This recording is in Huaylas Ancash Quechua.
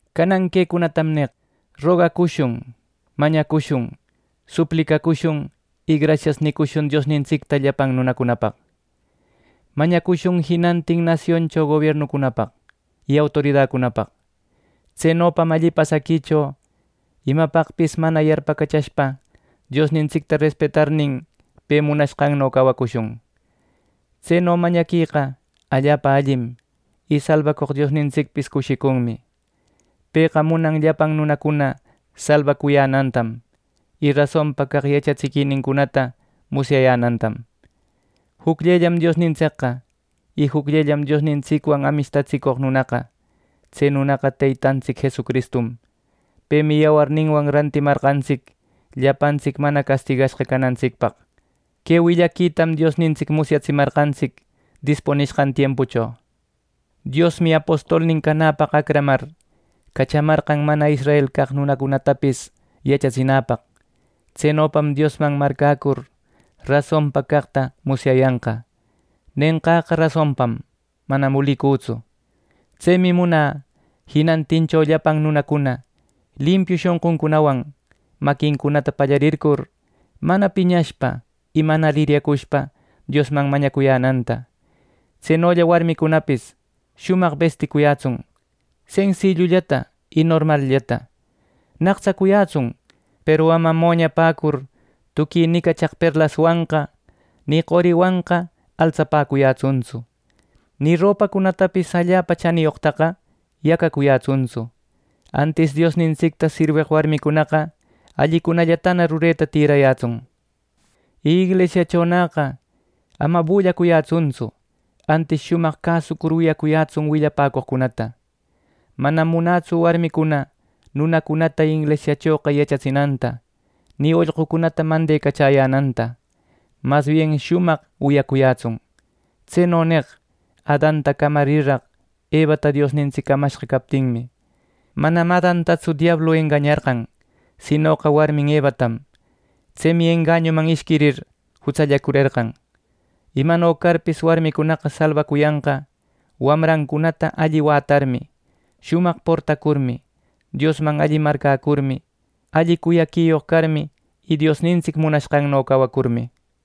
Canan quecunatam neq: Rogacushun, mañacushun, suplicacushun y grasias nïcushun Diosnintsicta llapan nunapaq. Mañacushun jinantin nasioncho gobiernucunapaq y autoridacunapaq. Tsenopam alli pasaquicho imapaqpis mana yarpacachashpa, Diosnintsicta respetarnin pe munashqanno cawacushun. Tseno mañaqueqa allapa allim; y salbacoq Diosnintsicpis cushicunmi. Pëqa munan llapan nunacuna salbacuyänantam, y rasonpa caq yachatsiquicunata musyayänantam. Jucllellam Diosnintsicqa, y jucllellam Diosnintsicwan amishtatsicoq nunaqa. Tse nunaqa Teytantsic Jesucristum. Pemi yawarninwan rescatamarqantsic llapantsic mana castigashqa canantsicpaq. Que willaquitam Diosnintsic musyaratsimarqantsic dispunishqan tiempuncho. Diosmi apostolnin canäpaq acramar, cachamarqan mana israel caq nunacunatapis yachatsinäpaq. Tsenopam Diosman marcäcur rasonpa caqta musyayanqa. Nenqäqa rasonpam; manam ulicütsu. Tsemi munä jinantincho llapan nunacuna limpiu shonquncunawan, maquincunata pallarircur, mana piñashpa y mana liryacushpa Diosman mañacuyänanta. Tsenolla warmicunapis shumaq besticuyätsun, sensillullata y normalllata. Naqtsacuyätsun, peru ama moñapäcur. Tuqui nicachaq perlaswanqa ni qoriwanqa altsapäcuyätsuntsu; ni ropacunatapis allapa chaniyoqtaqa yacacuyätsuntsu. Antis Diosnintsicta sirweq warmicunaqa allicunallatana rureta tïrayätsun. Y inglisiachonäqa ama bullacuyätsuntsu, antis shumaq cäsucur wiyacuyätsun willapäcoqcunata. Manam munätsu warmicuna nunacunata inglisiachoqa yachatsinanta, ni ollqucunata mandecachäyänanta. Mas bien shumaq wiyacuyätsun. Tseno neq: Adanta camarirraq Evata Diosnintsic camashqa captinmi. Manam Adantatsu diablu engañarqan, sinoqa warmin Evatam. Tsemi engañuman ishquir jutsallicurerqan. Imano carpis, warmicunaqa salbacuyanqa wawancunata alli wätarmi, shumaq portacurmi, Diosman alli marcäcurmi, alli cuyaquiyoq carmi y Diosnintsic munashqanno cawacurmi.